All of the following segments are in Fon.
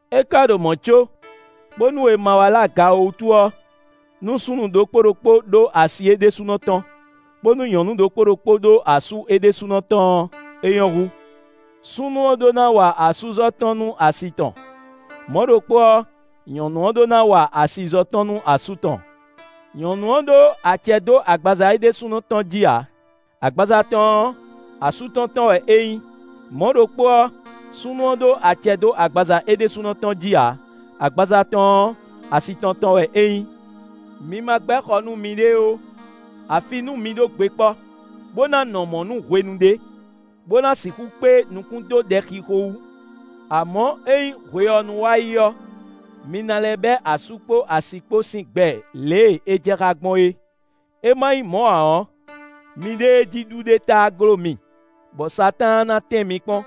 É ka ɖo mɔ̌ có, bónú è ma wá lɛ aga ó wútu ɔ́, nú súnnu ɖokpó ɖokpó ɖó asi é ɖésúnɔ tɔn, bónú nyɔ̌nu ɖokpó ɖokpó ɖó asú é ɖésúnɔ tɔn ɔ́, é nyɔ́ hú. Súnnu ɔ́ ɖó ná wa asúzɔ́ tɔn nú asi tɔn; mɔ̌ ɖokpó ɔ́, nyɔ̌nu ɔ́ ɖó ná wa asizɔ́ tɔn nú asú tɔn. Nyɔ̌nu ɔ́ ɖó acɛ dó agbaza é ɖésúnɔ tɔn jí ǎ; agbaza tɔn ɔ́, asú tɔn tɔn wɛ é nyí; mɔ̌ ɖokpó ɔ́, súnnu ɔ́ ɖó acɛ dó agbaza é ɖésúnɔ tɔn jí ǎ; agbaza tɔn ɔ́, asi tɔn tɔn wɛ é nyí. Mi ma gbɛ́ xɔ nú miɖée ó, afi nú mi ɖó gbe kpɔ́, bó ná nɔ mɔ̌ nú hwenu ɖé, bó ná sixú kpé nukún dó ɖɛxixo wú. Amɔ̌, ényí hwe ɔ́ nu wá yi ɔ́, mi ná lɛ́ bɛ́ asú kpó asi kpó sín gbɛ lě e é jɛ xá gbɔn é; é má nyí mɔ̌ ǎ ɔ́, miɖée jí ɖu ɖe táá gló mi, bɔ Satáan ná tɛ́n mi kpɔ́n.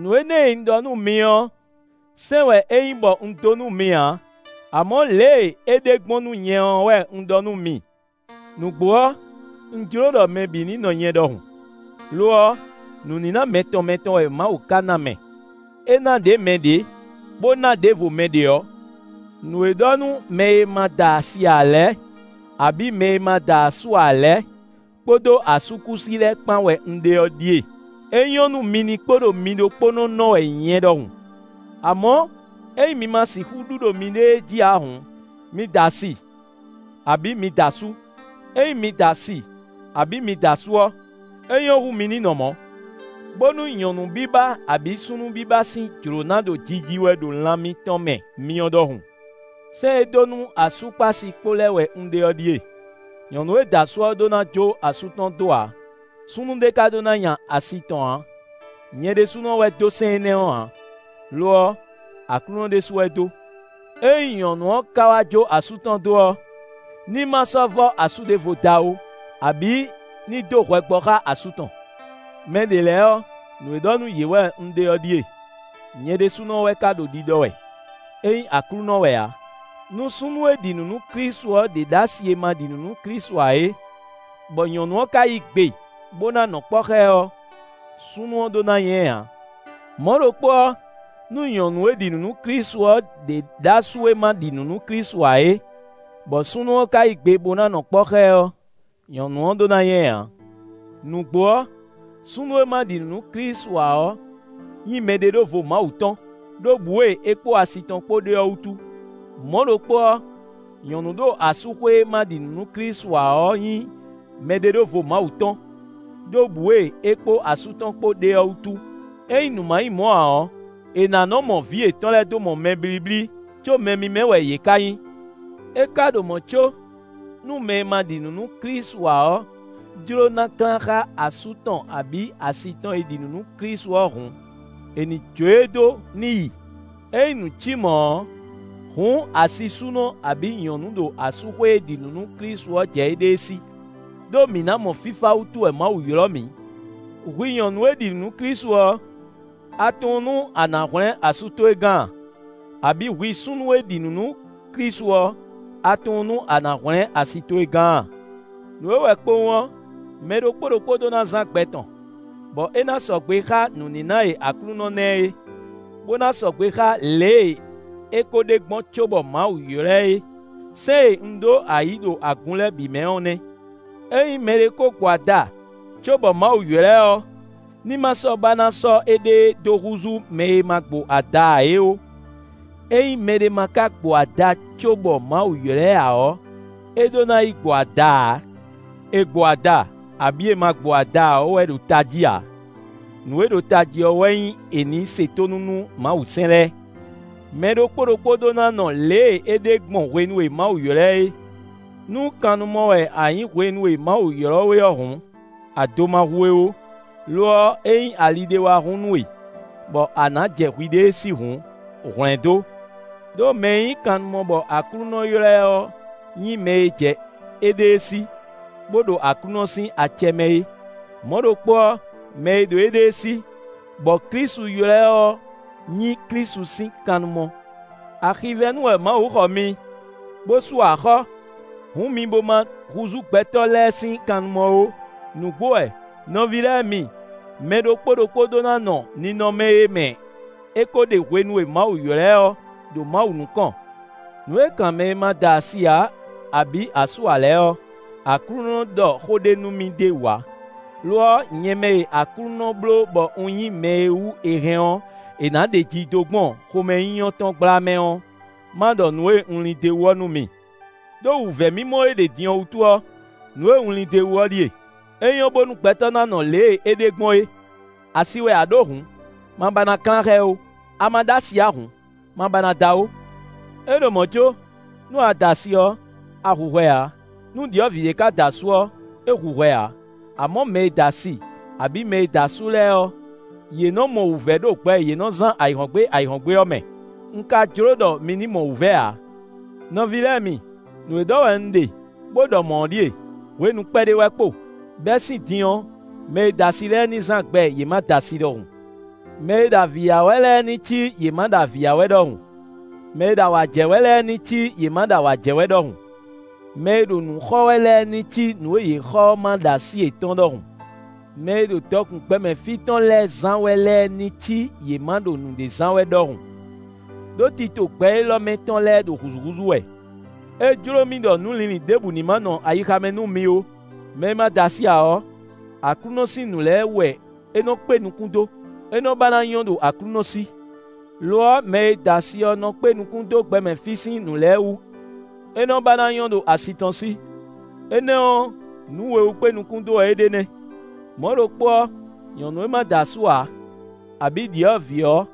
Nǔ énɛ́ e un ɖɔ nú mi ɔ́, sɛ́n wɛ é nyí bɔ un dó nú mi ǎ, amɔ̌ lě e é ɖe gbɔn nú nyɛ ɔ́ wɛ un ɖɔ nú mi. Nǔgbó ɔ́, un jló ɖɔ mɛ bǐ ní nɔ nyɛ ɖɔhun; lo ɔ́, nǔníná mɛtɔn mɛtɔn wɛ Mawu ka ná mɛ; é ná ɖě mɛ ɖě, bó ná ɖěvo mɛ ɖě ɔ́. Nǔ e ɖɔ nú mɛ e ma da asi ǎ lɛ́ɛ, abǐ mɛ e ma da asú ǎ lɛ́ɛ, kpódó asúkúsi lɛ́ɛ kpán wɛ un ɖe ɔ́ ɖíe: é nyɔ́ nú mi ní kpo ɖo mi ɖokpónɔ nɔ wɛ nyɛ ɖɔhun. Amɔ̌, ényí mi ma sixú ɖu ɖo miɖée jí ǎ hǔn, mi da asi, abǐ mi da asú: ényí mi da asi abǐ mi da asú ɔ́, é nyɔ́ hú mi ní nɔ mɔ̌, bónú nyɔ̌nu biba abǐ súnnu biba sín jlǒ na ɖo jiji wɛ ɖo lan mitɔn mɛ myɔ ɖɔhun. Sɛ́n e dó nú asú kpó asi kpó lɛ́ɛ wɛ un ɖe ɔ́ ɖíe: nyɔ̌nu e da asú ɔ́ ɖó ná jó asú tɔn dó ǎ; súnnu ɖě ká ɖó ná nya asi tɔn ǎ (nyɛ ɖésúnɔ wɛ dó sɛ́n énɛ́ ɔ́ ǎ; lo ɔ́, Aklúnɔ ɖésú wɛ dó). Ényí nyɔ̌nu ɔ́ ka wá jó asú tɔn dó ɔ́, ní ma sɔ́ vɔ́ asú ɖěvo da ó, abǐ ní dó hwɛ gbɔ xá asú tɔn. Mɛɖě lɛ́ɛ ɔ́, nǔ e ɖɔ nú yě wɛ un ɖe ɔ́ ɖíe (nyɛ ɖésúnɔ wɛ ka ɖo ɖiɖɔ wɛ; é nyí Aklúnɔ wɛ ǎ). Nú súnnu e ɖi nǔ nú Klísu ɔ́ ɖě ɖó asi e ma ɖi nǔ nú Klísu ǎ é, bɔ nyɔ̌nu ɔ́ ka yí gbe bó ná nɔ kpɔ́ xá ɛ ɔ́, súnnu ɔ́ ɖó ná nya ɛ ǎ. Mɔ̌ ɖokpó ɔ́, nú nyɔ̌nu e ɖi nǔ nú Klísu ɔ́ ɖě ɖó asú e ma ɖi nǔ nú Klísu ǎ é, bɔ súnnu ɔ́ ka yí gbe bó ná nɔ kpɔ́ xá ɛ ɔ́, nyɔ̌nu ɔ́ ɖó ná nya ɛ ǎ. Nǔgbó ɔ́, súnnu e ma ɖi nǔ nú Klísu ǎ ɔ́ nyí mɛɖeɖóvo Mawu tɔn, ɖó bǔ e é kpó asi tɔn kpó ɖe ɔ́ wútu. Mɔ̌ ɖokpó ɔ́, nyɔ̌nu ɖo asúxwé e ma ɖi nǔ nú Klísu ǎ ɔ́ nyí mɛɖeɖóvo Mawu tɔn, ɖó bǔ e é kpó asú tɔn kpó ɖe ɔ́ wútu. Ényí nǔ ma nyí mɔ̌ ǎ ɔ́, è nǎ nɔ́ mɔ vǐ yětɔn lɛ́ɛ dó mɔ mɛ blíblí, có mɛ mímɛ́ wɛ yě ká nyí. É ka ɖo mɔ̌ có, nú mɛ e ma ɖi nǔ nú Klísu ǎ ɔ́ jló ná klán xá asú tɔn abǐ asi tɔn e ɖi nǔ nú Klísu ɔ́ hǔn, é ní jó e dó ní yi; é nyí nǔ cí mɔ̌ ɔ́, hǔn asisúnɔ abǐ nyɔ̌nu ɖo asúxwé e ɖi nǔ nú Klísu ɔ́ jɛ éɖée sí; ɖó mǐ ná mɔ fífá wútu wɛ Mawu ylɔ́ mǐ. Hwi nyɔ̌nu e ɖi nǔ nú Klísu ɔ́, a tunwun nú a nǎ hwlɛ́n asú towe gán a? Abǐ hwi súnnu e ɖi nǔ nú Klísu ɔ́, a tunwun nú a nǎ hwlɛ́n asi towe gán a? Nǔ e wɛ kpowun ɔ́, mɛ ɖokpó ɖokpó ɖó ná zán gbɛ tɔn, bɔ é ná sɔgbe xá nǔníná e Aklúnɔ ná ɛ é, bó ná sɔgbe xá lě e é ko ɖe gbɔn cóbɔ Mawu ylɔ́ ɛ é; sɛ́n e un ɖó ayǐ ɖo agun lɛ́ɛ bǐ mɛ ɔ́ nɛ́. Ényí mɛɖé ko gbo ada cóbɔ Mawu ylɔ́ ɛ ɔ́, ní ma sɔ́ ba ná sɔ́ éɖée dó húzú mɛ e ma gbo ada ǎ é ó; ényí mɛɖé ma ka gbo ada cóbɔ Mawu ylɔ́ ɛ ǎ ɔ́, é ɖó ná yi gbo ada ǎ. È gbo ada abǐ è ma gbo ada ǎ ɔ́ wɛ ɖo tají ǎ; nǔ e ɖo tají ɔ́ wɛ nyí è nǐ se tónú nú Mawusɛ́n lɛ́ɛ. Mɛ ɖokpó ɖokpó ɖó ná nɔ lě e é ɖe gbɔn hwenu e Mawu ylɔ́ ɛ é. Nú kannumɔ wɛ a nyǐ hwenu e Mawu ylɔ́ we ɔ́ hǔn, ado ma hu we ó; lo ɔ́, ényí ali ɖé wá hun nú we, bɔ a nǎ jɛ hwiɖée sí hǔn, hwlɛ̌ndó. Đó mɛ e nyí kannumɔ bɔ Aklúnɔ ylɔ́ ɛ ɔ́ nyí mɛ e jɛ éɖée sí, bó ɖo Aklúnɔ sín acɛ mɛ é; mɔ̌ ɖokpó ɔ́, mɛ e ɖo éɖée sí, bɔ Klísu ylɔ́ ɛ ɔ́ nyí Klísu sín kannumɔ. Axivɛ́nu wɛ Mawu xɔ mi, bó sú axɔ́; hǔn mi bo ma húzú gbɛtɔ́ lɛ́ɛ sín kannumɔ ó. Nǔgbó wɛ! Nɔví lɛ́ɛ mi, mɛ ɖokpó ɖokpó ɖó ná nɔ ninɔmɛ e mɛ é ko ɖe hwenu e Mawu ylɔ́ ɛ ɔ́, ɖo Mawu nukɔn. Nǔ e kan mɛ e ma da asi ǎ abǐ asú ǎ lɛ́ɛ ɔ́, Aklúnɔ ɖɔ xó ɖé nú mì d'é wú ǎ; lo ɔ́, nyɛ mɛ e Aklúnɔ bló bɔ un nyí mɛ e wú è hɛn ɔ́, è nǎ ɖeji dó gbɔn xomɛnyínyɔ́ tɔn gbla mɛ ɔ́, ma ɖɔ nǔ e un lin d'é wú ɔ́ nú mi. Đó wǔvɛ́ mimɔ e ɖe din ɔ́ wútu ɔ́, nǔ e un lin d'é wú ɔ́ ɖíe: é nyɔ́ bónú gbɛtɔ́ ná nɔ lě e é ɖe gbɔn é. Asi wɛ a ɖǒ hǔn, ma ba ná klán xá ɛ ó; a ma ɖó asi ǎ hǔn, ma ba ná da ó. É ɖo mɔ̌ có, nú a da asi ɔ́, a hu hwɛ ǎ; nú ɖyɔ̌vǐ ɖé ka da asú ɔ́, é hu hwɛ ǎ. Amɔ̌, mɛ e da asi abǐ mɛ e da asú lɛ́ɛ ɔ́, yě nɔ mɔ wǔvɛ́ ɖo gbɛ e yě nɔ zán ayǐhɔ́ngbe ayǐhɔ́ngbe ɔ́ mɛ; un ka jló ɖɔ mi ní mɔ wǔvɛ́ ǎ. Nɔví lɛ́ɛ mi, nǔ e ɖɔ wɛ un ɖe, bó ɖɔ mɔ̌ ɔ́ ɖíe: hwenu kpɛɖé wɛ kpo; bɛ́ sín din ɔ́, mɛ e da asi lɛ́ɛ ní zán gbɛ yě ma da asi ɖɔhun. Mɛ e ɖo avǐ ya wɛ lɛ́ɛ ní cí yě ma ɖo avǐ ya wɛ ɖɔhun; mɛ e ɖo awǎ jɛ wɛ lɛ́ɛ ní cí yě ma ɖo awǎ jɛ wɛ ɖɔhun; mɛ e ɖo nǔ xɔ wɛ lɛ́ɛ ní cí nǔ e yě xɔ ɔ́ ma ɖo así yětɔn ɖɔhun. Mɛ e ɖo dɔkun gbɛmɛ fí tɔn lɛ́ɛ zán wɛ lɛ́ɛ ní cí yě ma ɖo nǔɖé zán wɛ ɖɔhun. Đó tito gbɛ élɔ́ mɛ tɔn lɛ́ɛ ɖo hǔzúhúzú wɛ. É jló mì ɖɔ nǔlinlin ɖěbǔ ní ma nɔ ayixa mɛ nú mi ó. Mɛ e ma da asi ǎ ɔ́, Aklúnɔ sín nǔ lɛ́ɛ wú wɛ é nɔ kpé nukún dó; é nɔ ba ná nyɔ́ ɖo Aklúnɔ sí. Lo ɔ́, mɛ e da asi ɔ́ nɔ kpé nukún dó gbɛmɛ fí sín nǔ lɛ́ɛ wú; é nɔ ba ná nyɔ́ ɖo asi tɔn sí. Énɛ́ ɔ́, nǔ we wú kpé nukún dó wɛ é ɖe nɛ́. Mɔ̌ ɖokpó ɔ́, nyɔ̌nu e ma da asú ǎ, abǐ ɖyɔ̌vǐ ɔ́,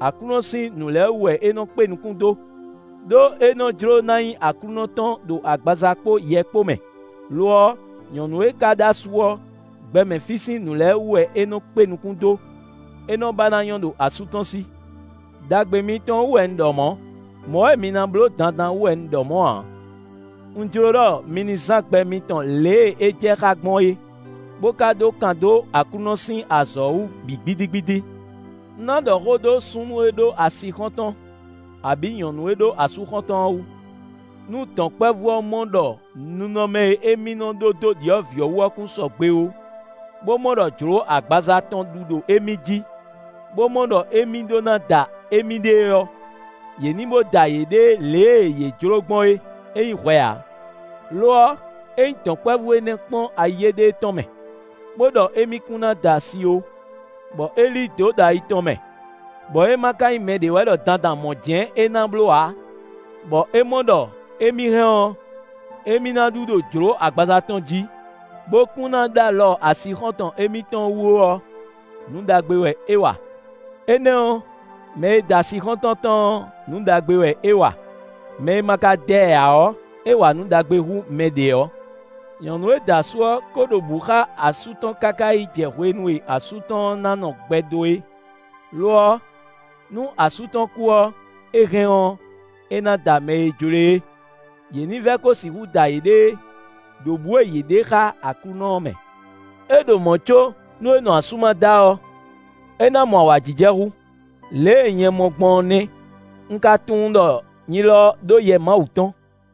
Aklúnɔ sín nǔ lɛ́ɛ wú wɛ é nɔ kpé nukún dó; ɖó é nɔ jló ná nyí Aklúnɔ tɔn ɖo agbaza kpó yɛ kpó mɛ; lo ɔ́, nyɔ̌nu e ka ɖó asú ɔ́, gbɛmɛ fí sín nǔ lɛ́ɛ wú wɛ é nɔ kpé nukún dó; é nɔ ba ná nyɔ́ ɖo asú tɔn sí. Đagbe mitɔn wú wɛ un ɖɔ mɔ̌; mɔ̌ wɛ mi ná bló gbɔn dandan wú wɛ un ɖɔ mɔ̌ ǎ; un jló ɖɔ mi ní zán gbɛ mitɔn lě e é jɛ xá gbɔn é, bó ka ɖó kan dó Aklúnɔ sín azɔ̌ ɔ́ wú bǐ gbídígbídí. Un ná ɖɔ xó dó súnnu e ɖó asixɔ́ntɔn, abǐ nyɔ̌nu e ɖó asúxɔ́ntɔn ɔ́ wú. Nú dɔ̌nkpɛvú ɔ́ mɔ ɖɔ ninɔmɛ e émí nɔ ɖó dó ɖyɔ̌vǐ ɔ́ wú ɔ́ kún sɔgbe ó, bó mɔ ɖɔ jlǒ agbaza tɔn ɖu ɖo émí jí, bó mɔ ɖɔ émí ɖó ná da émíɖée ɔ́, yě ní bó da yěɖée lě e yě jlǒ gbɔn é! É nyí hwɛ ǎ. Lo ɔ́, ényí dɔ̌nkpɛvú énɛ́ kpɔ́n ayi éɖée tɔn mɛ, bó ɖɔ émí kún ná da asi ó, bɔ é lí dǒ ɖo ayi tɔn mɛ, bɔ é ma ka nyí mɛɖé wɛ ɖɔ dandan mɔ̌ jɛ́n é ná bló ǎ, bɔ é mɔ ɖɔ émí hɛn ɔ́, émí ná ɖu ɖo jlǒ agbaza tɔn jí, bó kún ná ɖó alɔ asixɔ́ntɔn émítɔn wú ó ɔ́, nǔ ɖagbe wɛ é wa. Énɛ́ ɔ́, mɛ e da asixɔ́ntɔn tɔn ɔ́, nǔ ɖagbe wɛ é wa; mɛ e ma ka da ɛ ǎ ɔ́, é wa nǔ ɖagbe hú mɛ ɖě ɔ́. Nyɔ̌nu e da asú ɔ́, ko ɖo bǔ xá asú tɔn káká yi jɛ hwenu e asú tɔn ɔ́ na nɔ gbɛ dó é. Lo ɔ́, nú asú tɔn kú ɔ́, é hɛn ɔ́, é ná da mɛ e jló e é; yě ní vɛ ko sixú da yěɖée ɖo bǔ e yě ɖe xá Aklúnɔ ɔ́ mɛ. É ɖo mɔ̌ có, nú é nɔ asú ma da ɔ́, é ná mɔ awǎjijɛ hú; lě e nyɛ mɔ gbɔn ɔ́ nɛ́; un ka tunwun ɖɔ nyi lɔ ɖó Yɛ Mawu tɔn.